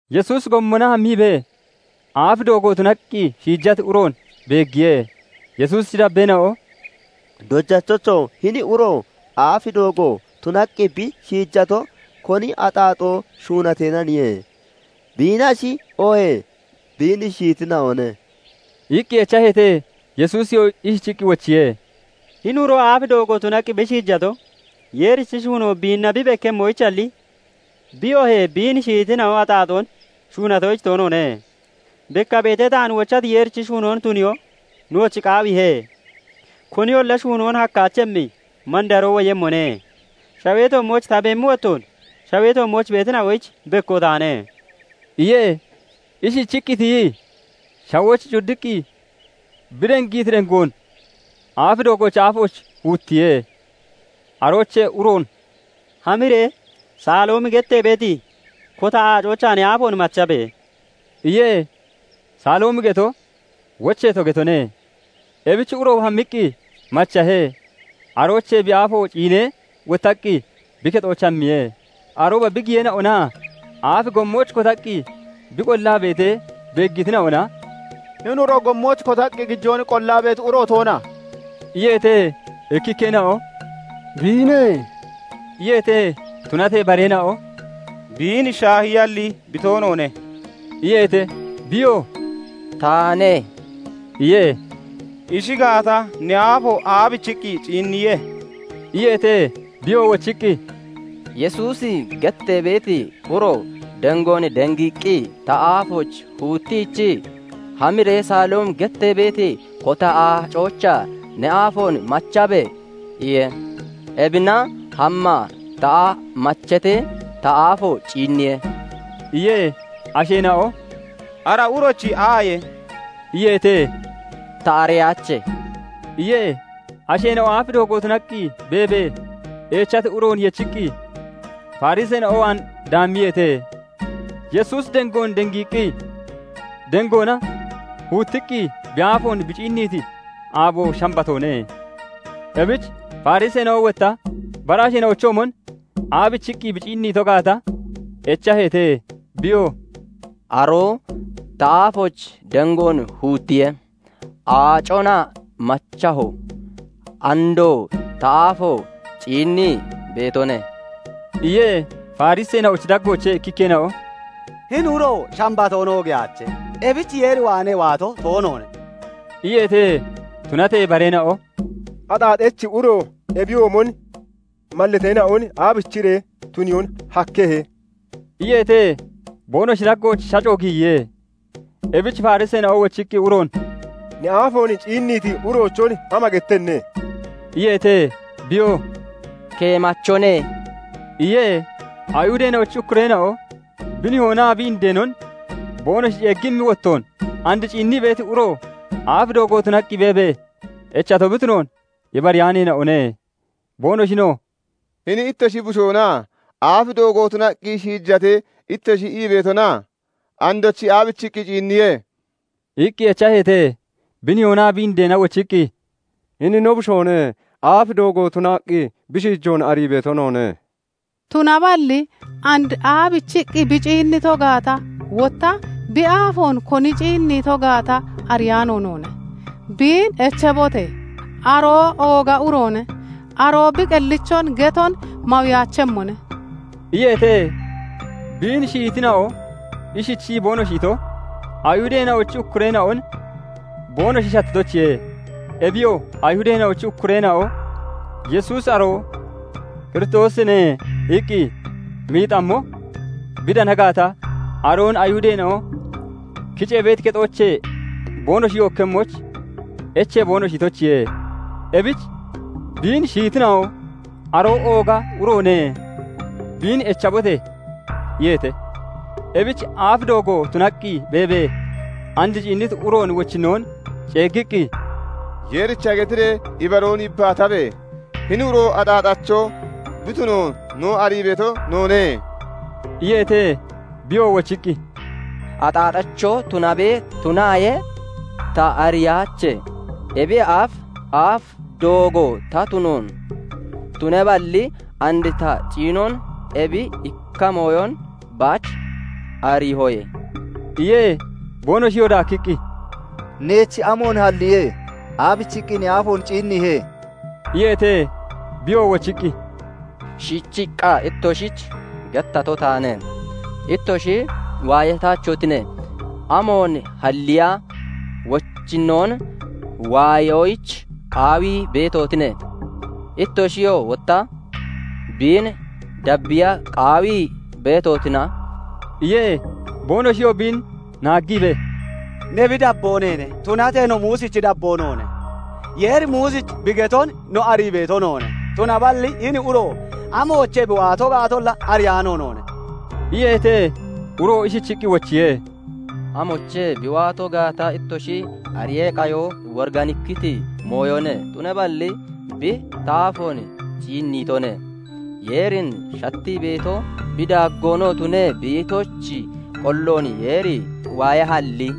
Yesuusi gommona hammiibee, aaf doogo tunaqqi shiijati uroon beeggiye. Yesuusichi dabbeena'o "Dojachocho! Hini uro aaf doogo tunaqqi bi shiijato, koni axaaxoon shuunateenaniye? Biinnashi oohee biin shiyitina'one?" iqqi echaheete. Yesuusiyoo ishichiqqi wochiye:- "Hini uro aaf doogo tunaqqi bi shiijato, Yeerichi shuunoo biinna bi bekkemmoyichalli, bi oohee biin shiyitina'o axaaxoon shuunatoyich toonoone. Bekka beetee, taan wochati Yeerichi shuunoon tuniyoo nooch qaawiihe; koniyolla shuunoon hakkaachemmi mandaroo woyemmone. Shawee toommooch ta beemmi wottoon, shawee toommooch beetina'oyich bekko taane" iye. Ishichiqqi tiyii shawooch cuddiqqi bi dengiiti dengoon aaf doogoochi aafooch huuttiye. Aroochee uroon "Hamiree Saloomi gettee beeti kota aacoochaa ne aafoon machabe!" iye. Saloomi geto "Wocheeto" getone. Ebich uro hammiqqi machahe; aroochee bi aafo ciinee wottaqqi bi kexooch hammiye. Arooba bi giyeena'onaa aaf goommooch kotaqqi bi qollaa beetee beeggitina'ona "Hini uro gommooch kotaqqi gijoon qollaa beeti uro toona?" iyeete. Ikkikkeena'o "Biine" iyeete; tunatee bareena'o "Biin shaahiyalli, bi toonoone" iyeete. Biyoo "Taane" iye. "Ishi gaata, ne aafo aabichiqqi ciinniye?" iyeete. Biyoo wochiqqi, "Yesuusi gettee beeti uro dengoon dengiiqqi ta aafooch huuttiichii, 'Hamiree Saloomi gettee beeti kota aacoochaa ne aafoon machabe!' iye. Ebina hammaa ta machatee, ta aafo ciinniye" iye. Asheena'o "Ara urochi aaye?" iyeete. "Ta ariyaache" iye. Asheena'o aaf doogo tunaqqi beebee echati uroon yechiqqi Fariseena'o waan daammiyeete. Yesuusi dengoon dengiiqqi dengoona huuttiqqi bi aafoon bi ciinniiti aabo Shambatoone. Ebich Fariseena'o wotta bara asheena'ochoomon aabichiqqi bi ciinnito gaata echaheete. Biyoo "aroo ta aafooch dengoon huuttiye; aacona machaho; andoo ta aafo ciinnii beetone" iye. Fariseena'ochi daggoochee ikkikkeena'o "Hini uro Shambatoon oogiyaache; ebich Yeer waanee waato toonoone" iyeete. Tunatee bareena'o "Axaaxachi uro ebiyoomon mallateena'on aabichiree tuniyoon hakkehe?" iyeete. Boonoshi daggooch shaco giyiye. Ebich Fariseena'o wochiqqi uroon "Ne aafoon ciinniiti uroochon ama gettenne?" iyeete. Biyoo "Keemachone" iye. Ayihudeena'ochi ukkureena'o bi nihoonaa bi indeenon boonoshi ceeggimmi wottoon, and ciinnii beeti uro aaf doogo tunaqqi beebee echato bi tunoon ibariyaaneena'one. Boonoshinoo "Hini ittoshi bushoona? 'Aaf doogo tunaqqi shiijate' ittoshi ii beetona? Andochi aabichiqqi ciinniye?" iqqi echaheete. Bi nihoonaa bi indeena wochiqqi, "Hini no bushoone; aaf doogo tunaqqi bi shiijoon arii beeto noone; Tunaballi and aabichiqqi bi ciinnito gaata, wotta bi aafoon koni ciinniito gaata ariyaano noone. Biin echabote! Aroo ooga uroone; aroo bi qellichon geton mawiyaachemmone" iyeete. Biin shiyitina'o ishichii boonoshi ito, Ayihudeena'ochi ukkureena'on boonoshi shattitoyichiye. Ebiyoo Ayihudeena'ochi ukkureena'o "Yesuusi aroo Kiristoosine" iqqi miixammo bi dana gaata, aroon Ayihudeena'o kicee beeti kexoochee boonoshi yookkemmoyich echee boonoshi itoyichiye. Ebich biin shiyitina'o "Aroo ooga uroone; biin echabote!" iyeete. Ebich aaf doogo tunaqqi beebee and ciinniti uroon wochinnoon ceeggiqqi, "Yeericha getiree ibaroon yibbaatabe! Hini uro axaaxacho bi tunoon no arii beeto noone" iyeete. Biyoo wochiqqi, "Axaaxacho tunabe, tunaaye ta ariyaache. ebiyee aaf, aaf doogo ta tunoon, tunaballi and ta ciinon ebi ikka mooyon baach ariihoye" iye. Boonoshiyoo daakkiqqi, "Neech amoon halliye? Aabichiqqi ne aafoon ciinniihe?" iyeete. Biyoo wochiqqi, "Shiichiqqa ittoshich gettato taane; ittoshi waayataachotine; amoon halliya wochinnoon waayoyich qaawii beetotine? Ittoshiyoo wotta biin dabbiya qaawii beetotina?" iye. Boonoshiyoo biin naaggiibee, "Ne bi dabboo neene; tunatee no Muusichi dabboo noone. Yeeri Muusich bi geton no arii beeto noone; tunaballi hini uro amoochee bi waato gaatolla ariyaano noone" iyeete. Uroo ishichiqqi wochiye:- "Amoochee bi waato gaata ittoshi ariyee qayo woriganikkiti mooyone; tunaballi bi ta aafoon ciinniitone. Yeerin shattii beeto, bi daaggoonoo tunii beetochi qolloon Yeeri waayahalli,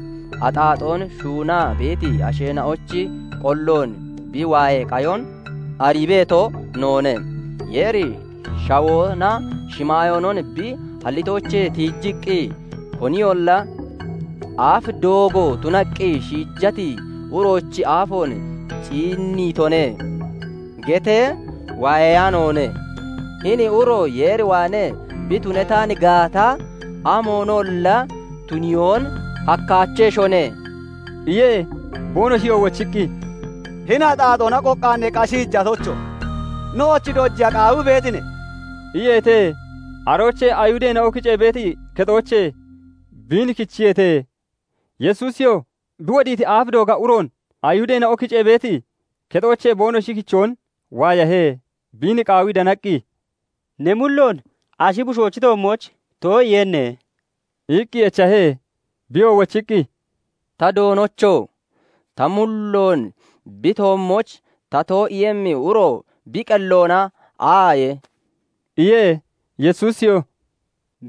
axaaxoon shuunaa beeti asheena'ochi qolloon bi waayee qayon arii beeto noone. Yeeri shawoonaa shimaayoonon bi hallitoochee tiijiqqi, koniyolla 'Aaf doogo tunaqqi shiijati uroochi aafoon ciinniitone' getee waayeyaanoone. Hini uro Yeer waanee bi tunataan gaata, amoonolla tuniyoon hakkaacheshone" iye. Boonoshiyoo wochiqqi, "Hini axaaxoona qoqqaanneeqqa shiijatocho! Nooch dojiya qaawii beetine?" iyeete. Aroochee Ayihudeena'o kicee beeti kexoochee biin kichiyeete. Yesuusiyoo bi wodiiti aaf dooga uroon Ayihudeena'o kicee beeti kexoochee boonoshi kichoon waayahe. Biin qaawii danaqqi, "Ne mulloon Ashi Bushoochi toommooch too'iiyenne?" iqqi echahe. Biyoo wochiqqi, "Ta doonocho! Ta mulloon bi toommooch ta too'iiyemmi uro bi qelloona aaye?" iye. Yesuusiyoo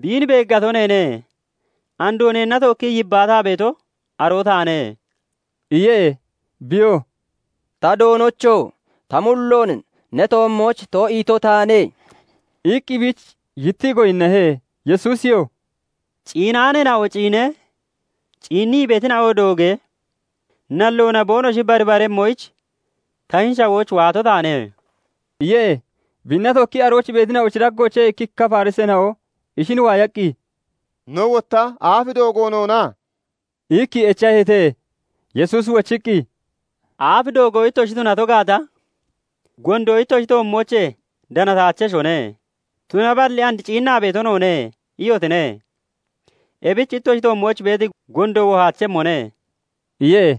"Biin beeggato neene. Andoo neenna tookkii yibbaataa beeto aroo taane" iye. Biyoo "Ta Doonocho! Ta mulloon ne toommooch too'iito taane" iqqi biich yittii goyinnahe. Yesuusiyoo "Ciinaaneena'o ciinee, ciinnii beetina'o doogee, nalloona boonoshi baribaremmoyich, ta hini shawooch waato taane" iye. Biinna tookkii arooch beetina'ochi daggoochee ikkikka Fariseena'o ishin waayaqqi, "No wotta aaf doogo noona?" iqqi echaheete. Yesuusi wochiqqi, "Aaf doogo ittoshi tunato gaata, gondo ittoshi toommoochee danataacheshone. Tunaballi and 'Ciinnaa beeto noone' iyotine; ebich ittoshi toommooch beeti gondo wohaachemmone" iye.